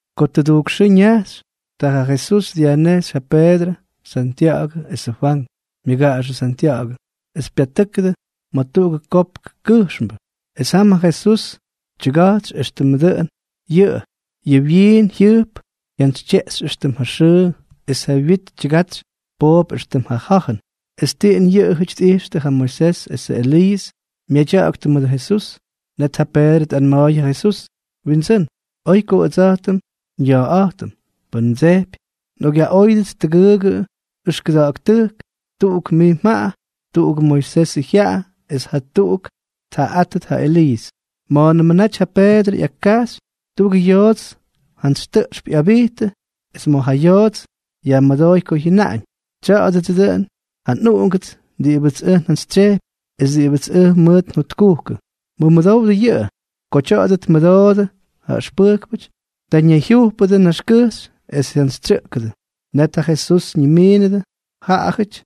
Ko tʉdujk xʉʉ ñajxy, ta ja Jesús dyajnejxy ja Peedrʉ, Santya̱ꞌa̱gʉ esʉ Fwank, myʉgaꞌaxʉ Santya̱ꞌa̱gʉ, es pyatʉ́kʉdʉ ma̱ tuꞌugʉ kopkʉ kʉjxmbʉ. Es jam ja Jesús tyʉga̱jtsy éxtʉmʉ dʉꞌʉn yʉꞌʉ. Yʉ wyiin jyʉjp jyantsytyeꞌxy éxtʉm ja xʉʉ, es ja wyit tyʉga̱jtsy poop éxtʉm ja ja̱jʉn. Es tiꞌin yʉꞌʉjʉty tꞌijxtʉ ja Moisés esʉ Eliiʉs myadya̱ꞌa̱ktʉ mʉdʉ Jesús. Net ja Peedrʉ tꞌanma̱a̱y ja Jesús: —Windsʉ́n, ¡oy ko ʉdsa̱jtʉm nya̱a̱ꞌa̱jtʉm! Pʉn mdsejpy, nꞌokꞌyaꞌóyʉdʉts tʉgʉʉgʉ ʉxkʉda̱ꞌa̱k tʉjk, tuꞌuk mij mjaꞌa, tuꞌugʉ Moisés jyaꞌa es jatuꞌuk tjaꞌaꞌátʉt ja Eliiʉs. Ma̱a̱nʉmʉ naty ja Peedrʉ ꞌyakkajxy, tuꞌugʉ yoots jantsy tʉꞌxp ꞌyabijttʉ, es ma̱ ja yoots yajmʉdooy ko jyʉnaꞌañ: —Tya̱a̱dʉdsʉ dʉꞌʉn ja nꞌUꞌungʉts diꞌibʉts ʉj njantsytsyejpy es diꞌibʉts ʉj mʉʉt njotkujkʉ. ¡Mʉmʉdowdʉ yʉꞌʉ! Ko tya̱a̱dʉ tmʉdoodʉ ja ʉxpʉjkpʉty, ta ñayjyujpʉdʉ naxkʉjxy es jyantsytsyʉꞌkʉdʉ. Net ja Jesús ñimiinʉdʉ jaꞌajʉty,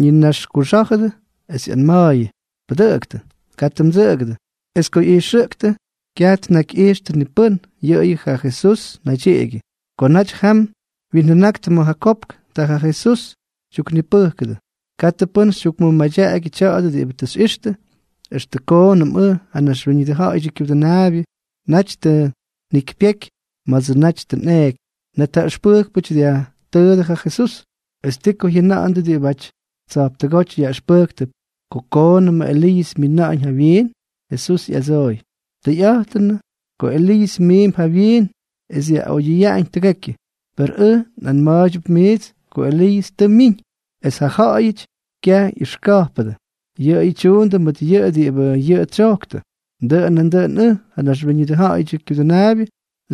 ñinaxkuxá̱jʉdʉ, es ꞌyanma̱a̱yʉ: —¡Pʉdʉꞌʉktʉ! ¡Katʉ mdsʉꞌʉgʉdʉ! Es ko ꞌyijxʉꞌktʉ, kyaj tnakyꞌijxtʉ ni pʉ́n, yʉꞌʉyʉ ja Jesús naydyiꞌigyʉ. Ko naty jam wyinjʉnaktʉ ma̱ ja kopk, ta ja Jesús tyuknipʉjkʉdʉ: —¡Katʉ pʉ́n xytyukmʉmadyaꞌagyʉ tya̱a̱dʉ diꞌibʉ tʉ xyꞌixtʉ extʉ koonʉm ʉj, ja Naxwíñʉdʉ Ja̱ꞌa̱yʉdyʉ Kyudʉnaabyʉ, naty tʉ njikypyeky ma̱dsʉ naty tʉ nꞌeeky! Net ja ʉxpʉjkpʉty dyajtʉʉdʉ ja Jesús: —¿Es ti ko jyʉna̱ꞌa̱ndʉ diꞌibʉty tsa̱jptʉgóty yaꞌʉxpʉjktʉp ko koonʉm Eliiʉs myina̱ꞌa̱ñ jawyiin? Jesús ꞌyadsooy: —Tʉyꞌa̱jtʉnʉꞌʉ ko Eliiʉs miimp jawyiin es dyaꞌoyʉyaꞌañ tʉgekyʉ. Per ʉj nꞌanma̱a̱ydyʉp miits ko Eliiʉs tʉ myiñ, es ja ja̱ꞌa̱yʉty kyaj ꞌyʉxka̱jpʉdʉ. Yʉꞌʉyʉ tyuundʉ mʉt yʉꞌʉ diꞌibʉ yʉꞌʉ tsyojktʉ. Dʉꞌʉn nandʉꞌʉn ʉj, ja Naxwíñʉdʉ Ja̱ꞌa̱yʉdyʉ Kyudʉnaabyʉ,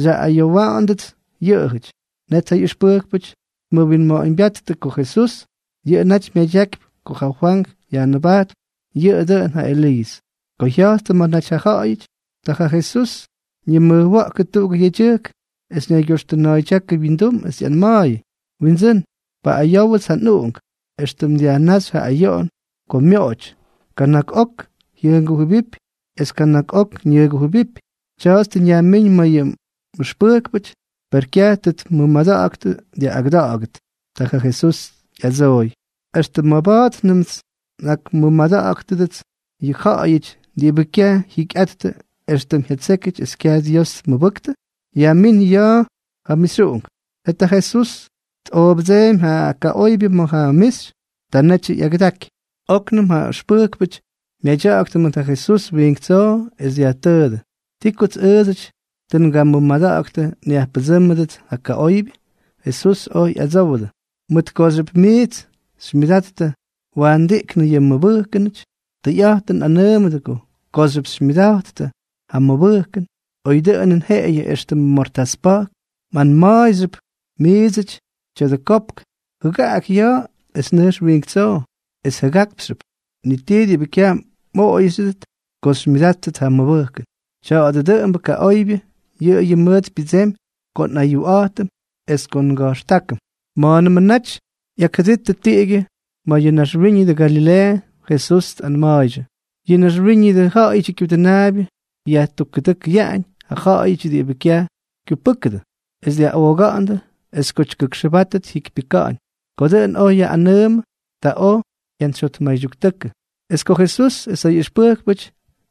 xyaꞌꞌayowa̱ꞌa̱ndʉts yʉꞌʉjʉty. Net ja ꞌyʉxpʉjkpʉty tmʉwinma̱ꞌa̱ñbyáttʉ ko Jesús yʉꞌʉ naty myadyakypy ko ja Fwank Yajnʉbajtpʉ yʉꞌʉ dʉꞌʉn ja Eliiʉs. Ko jya̱jttʉ ma̱ naty ja ja̱ꞌa̱yʉty, ta ja Jesús ñimʉjwa̱ꞌkʉ tuꞌugʉ yedyʉjk, es ñaygyoxtʉna̱a̱ydyákʉ wyindum, es ꞌyanma̱a̱yʉ: —Windsʉ́n, paꞌꞌayówʉts ja nꞌuꞌunk, éxtʉm dyajnáxy ja ayoꞌon ko myoꞌoty. Kana̱k ok jyʉngujʉbipy es kana̱k ok ñʉgujʉbipy. Tya̱a̱ts tʉ njayajmíñ ma̱ yʉ mꞌʉxpʉjkpʉty, per kyaj tʉ tmʉmada̱ꞌa̱ktʉ dyaꞌꞌagʉda̱ꞌa̱gʉt. Ta ja Jesús ꞌyadsooy: —¿Extʉ maba̱a̱tnʉmts nꞌakmʉmada̱ꞌa̱gʉdʉts yʉ ja̱ꞌa̱yʉty diꞌibʉ kyaj jyikyꞌattʉ éxtʉm jyatsékyʉty es kyaj Dios tmʉbʉktʉ? Yajmín ja ya̱a̱ ja mixyuꞌunk. Net ja Jesús tꞌoobʉdseemy ja kaꞌoybyʉ ma̱ ja mixy. Ta netyʉ ꞌyagʉdaky. Oknʉm ja ʉxpʉjkpʉty myadyaktʉ mʉt ja Jesús wiink tsoo, es dyajtʉʉdʉ: —¿Ti kots ʉʉdsʉty tʉ ngamʉmada̱ꞌa̱ktʉ nyajpʉdsʉ́mʉdʉts ja kaꞌoybyʉ? Jesús oj ꞌyadsówʉdʉ: —Mʉt kooxyʉp miits xymyʉdattʉ waandiꞌknʉ yʉ mmʉbʉjkʉnʉty. Tʉyꞌa̱jtʉn nꞌanʉʉmʉdʉ kooxyʉp xymyʉdattʉ ja mʉbʉjkʉn, oy dʉꞌʉnʉn jeꞌeyʉ éxtʉmʉ mortás pa̱jk, mꞌanmaapxyʉp miidsʉty tya̱dʉ kopk: “Jʉgaꞌak ya̱a̱ es nʉjx wiink tsoo”, es jʉgákpxyʉp. Ni ti diꞌibʉ kyaj mꞌoꞌoyxyʉdʉt ko xymyʉdattʉ ja mʉbʉjkʉn. Tya̱a̱dʉ dʉꞌʉmbʉ kaꞌoybyʉ, yʉꞌʉyʉ mʉʉt pyʉdsemy ko nꞌayuꞌa̱jtʉm es ko nga̱jxtákʉm. Ma̱a̱nʉmʉ naty ꞌyakjʉdittʉ tiꞌigyʉ ma̱ yʉ ñaxwíñʉdʉ Galileeʉ, Jesús tꞌanma̱a̱ydyʉ: —Yʉ Naxwíñʉdʉ Ja̱ꞌa̱yʉdyʉ Kyudʉnaabyʉ yajtukkʉdʉkʉyaꞌañ ja ja̱ꞌa̱yʉty diꞌibʉ kyaj kyupʉ́kʉdʉ, es dyaꞌooga̱ꞌa̱ndʉ, es ko tyʉgʉkxʉbátʉt, jyikypyʉka̱ꞌa̱ñ. Ko dʉꞌʉn oj yaꞌꞌanʉʉmʉdʉ, ta oj jyantsyjyotmaybyʉktʉ. Es ko Jesús es ja ꞌyʉxpʉjkpʉty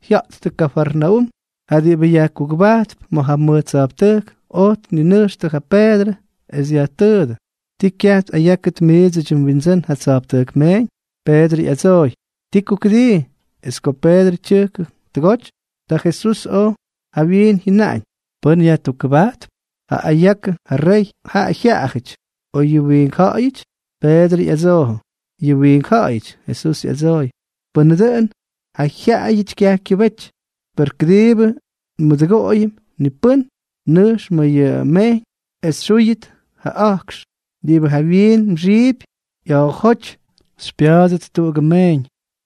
jya̱jttʉ Kafarnaúm, ja diꞌibʉ yajkugʉbajttʉp ma̱ ja mʉj tsa̱jptʉjk oj tninʉjxtʉ ja Peedrʉ, es dyajtʉʉdʉ: —¿Ti kyaj tꞌayákʉt miidsʉdyʉ mwindsʉ́n ja tsa̱jptʉjk meeñ? Peedrʉ ꞌyadsooy: —¡Ti ko kʉdii! Es ko Peedrʉ tyʉjkʉ tʉgoty, ta Jesús oj jawyiin jyʉnaꞌañ: —¿Wiꞌix mjʉna̱ꞌa̱ñ, Simonk? ¿Pʉ́n yajtukkʉbajtp ja ayakʉ ja réyʉty, ja jyaꞌayʉty, o yʉ wiink ja̱ꞌa̱yʉty? Peedrʉ ꞌyadsoojʉ: —Yʉ wiink ja̱ꞌa̱yʉty. Jesús ꞌyadsooy: —Pʉnʉ dʉꞌʉn, ja jyaꞌayʉty kyaj kyʉbety. Per kʉdiibʉ nmʉdʉgoꞌoyʉm ni pʉ́n, nʉjx ma̱ yʉ mejyñ es xyúyʉt ja a̱jkx. Es diꞌibʉ jawyiin mxiipy, ꞌya̱a̱jóty xypya̱a̱dʉt tuꞌugʉ meeñ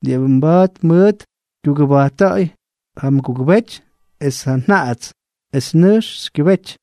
diꞌibʉ mba̱a̱t mʉʉt xykyʉbajtta̱ꞌa̱y ja mgugʉbety es ja njaꞌats. Es nʉjx xykyʉbety.